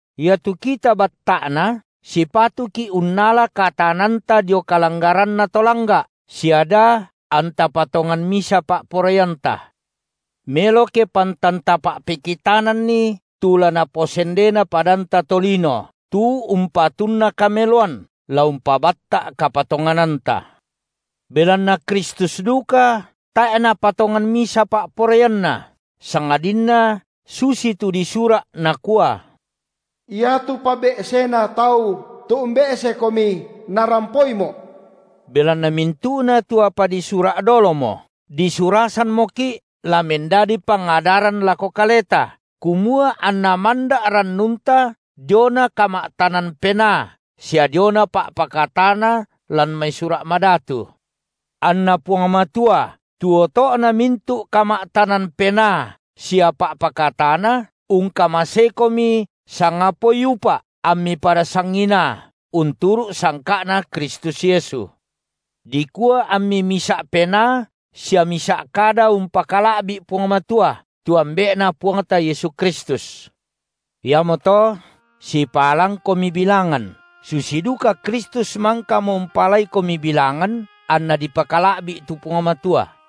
Iatu kita batta’na sipatuki’ unnala kataananta dio kalanggaranna to langga’ sia da anta patongan misa pa’poraianta. Melo ke pantan tapa’pekitananni tu la naposendena padanta tolino tu umpatunna kameloan la umpabatta’ kapatongananta. Belanna Kristus duka tae’ Napatongan misa pa’poraianNa, sangadinna susitu disura’, nakua: Iatu pabe’sena tau, tu umbe’seKomi, narampoiMo’. Belanna mintu’na tu apa disura’ dolomo, disurasammoki’ la mendadi pangadaran lako kaleta, kumua anna manda’ rannunta diona kama’tanan penaa sia diona pa’pakatana lan mai Sura’ Madatu. Anna Puang Matua, tu oto’na mintu’ kama’tanan penaa sia pa’pakatana, ungkamaseikomi sangapaoi upa’ ammi pada sanginaa, unturu’ sangka’Na Kristus Yesu, dikua ammi misa’ penaa sia misa’ kada umpakala’bi’ Puang Matua, tu Ambe’Na Puangta Yesu Kristus. Iamoto sipaalangkomi bilangan, susi duka Kristus mangkamo umpaalaikomi bilangan anna dipakala’bi’ tu Puang Matua.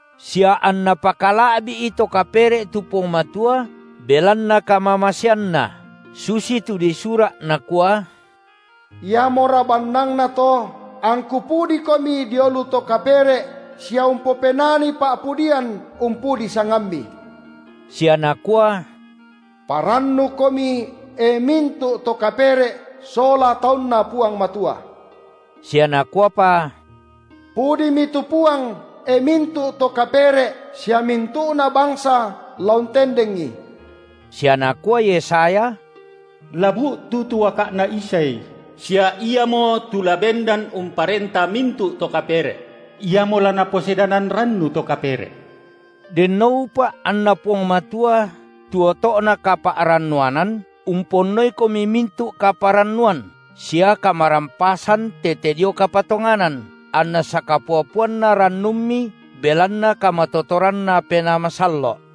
sia anna pakala’bi’i to kapere’ tu Puang Matua belanna kamamaseanNa, susitu disura’ nakua: Iamora bannangna to angku pudiKomi dio lu to kapere’ sia umpopenani pa’pudian umpudi sangamMi. Sia nakua: Parannukomi, e mintu’ to kapere’ sola taunNa Puang Matua. Sia nakuapa: Pudimi tu Puang, e mintu’ to kapere’ sia mintu’na bangsa la untendengi. Sia nakua Yesaya: La bu’tu tu uaka’na Isai, sia Iamotu la bendan umparenta mintu’ to kapere’; Iamo la naposedanan rannu to kapere’. Denno upa’ anNa Puang Matua, tu oto’na kapa’rannuanan, umponnoikomi mintu’ kaparannuan sia kamarampasan tete dio kapatonganan, anna sakapua-puana rannummi belanna kamatotoranNa Penaa Masallo’.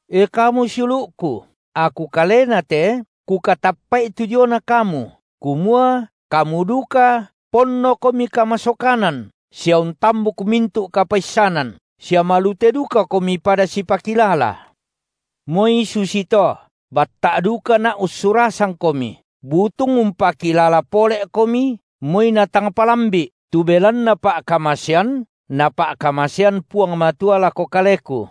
E kamu siulu’ku, aku kalena te kukatappa’i tu diona kamu, kumua kamu duka ponnokomi kamasokanan sia untambuk mintu’ kapaissanan, sia malute dukakomi pada sipakilala. Moi susito, batta’ dukana’ ussurasangkomi, butung umpakilala pole’komi moi natang palambi’, tu belanna pa’kamasean Napa’kamasean Puang Matua lako kaleku,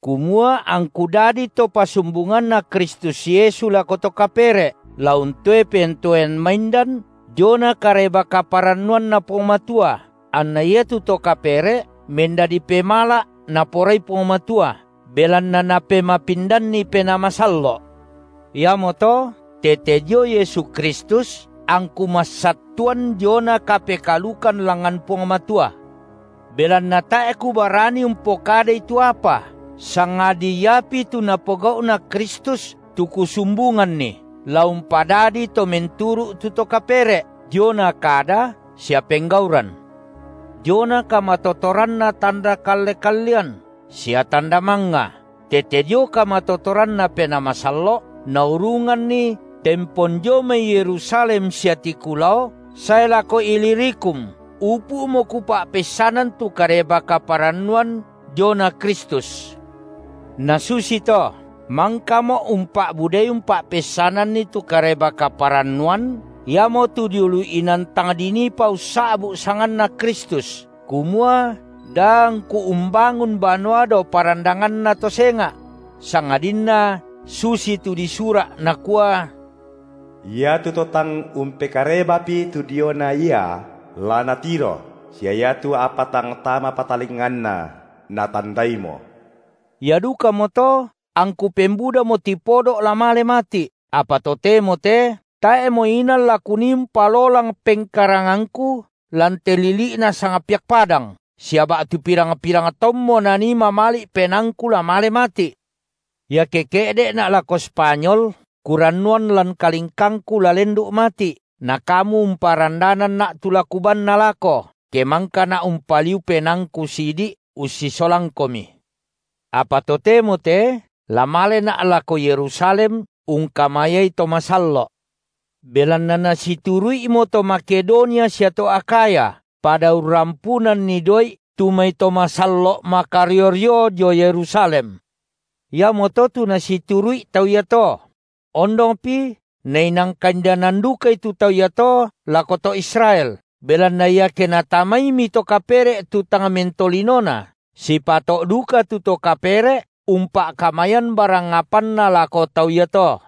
kumua angku dadi to pasumbunganna Kristus Yesu lako to kapere’ la untoe pentoean maindan diona Kareba-kaparannuanNa Puang Matua, anna iatu to kapere’ mendadi pemala’ Naporai Puang Matua, belanna Napemapindanni Penaa Masallo’. Iamoto tete dio Yesu Kristus angku massattuan diona kapekaalukan langngan Puang Matua. Belanna tae’ kubarani umpokadai tu apa, sangadi iapi tu Napogau’na Kristus tu kusumbunganni, la umpadadi to menturu’ tu to kapere’, diona kada sia penggauran; diona kamatotoranna tanda kalle-kallean sia tanda mangnga, tete dio kamatotoranNa Penaa Masallo’, naurunganni tempon dio mai Yerusalem sia tiku lao sae lako Ilirikum upu’mo kupa’peissanan tu Kareba-kaparannuan diona Kristus. Na susito mangkamo’ umpa’budai umpa’peissananni tu Kareba-kaparannuan, iamotu dio lu inan tang diniipa ussa’bu’ sanganNa Kristus, kumua da angku umbangun banua dao parandanganna to senga’; sangadinna susitu disura’, nakua: Iatu to tang umpekarebapi tu diona Ia, la natiro, sia iatu apa tang tamapa talinganna, natandaimo. Ia dukamoto, angku pembudamo tipodo’ la male mati’, apa totemo te tae’mo inan la kunii umpalolang pengkarangangku lan te lili’na sangpiak padang, sia ba’tu pirang-pirang taunmo nanii mamali’ penaangku la male mati’. Iake ke’de’na’ lako Spanyol, kurannuan lan kalingkangku la lendu’ mati’, na kamu umparandananna’ tu la kubaanna lako, ke mangkana’ umpaliu penaangku sidi’ ussisolangkomi. Apa totemo te la malena’ lako Yerusalem ungkamayai to masallo’. Belanna nasituru’imo to Makedonia sia to Akhaya pada urrampunanni doi’ tu mai to masallo’ makario-rio dio Yerusalem. Iamoto tu nasituru’i tau iato: ondongpi nainang kaindanan dukai tu tau iato lako to Israel, belanna iake natamaimi to kapere’ tu tang mentolinona, sipato’ duka tu to kapere’ umpa’kamayan barang apanna lako tau iato.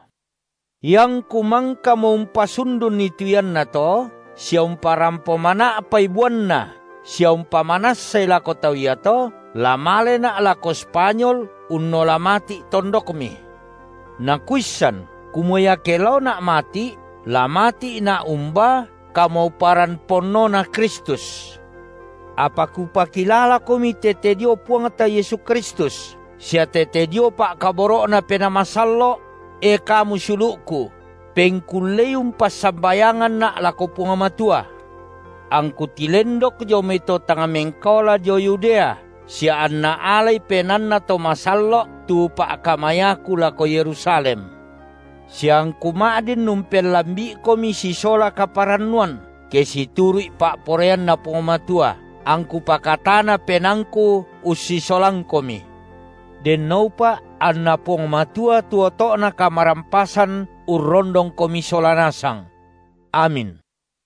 Iangku mangkamo umpasundunni tu iannato sia umparampo mana’pai buanna sia umpamanassai lako tau iato, la malena’ lako Spanyol unnola mati’ tondokmi. Na kuissan kumua iake laona’ mati’, la mati’na umbaa kamauparan ponnoNa Kristus. Apa kupakilalakomi, tete dio Puangta Yesu Kristus sia tete dio pa’kaboro’Na Penaa Masallo’, (e kamu siulu’ku), pengkullei umpassambayanganna’ lako Puang Matua, angku tilendok dio mai to tang mengkaola dio Yudea sia anna alai penaanna to masallo’ tu pa’kamayaku lako Yerusalem, sia angku ma’din umpellambi’ikomi sisola kaparannuan, ke situru’i pa’poraianNa Puang Matua, angku pakatana penaangku ussisolangkomi. Denno upa’ anNa Puang Matua, tu oto’na kamarampasan, urrondongkomi sola nasang. Amin.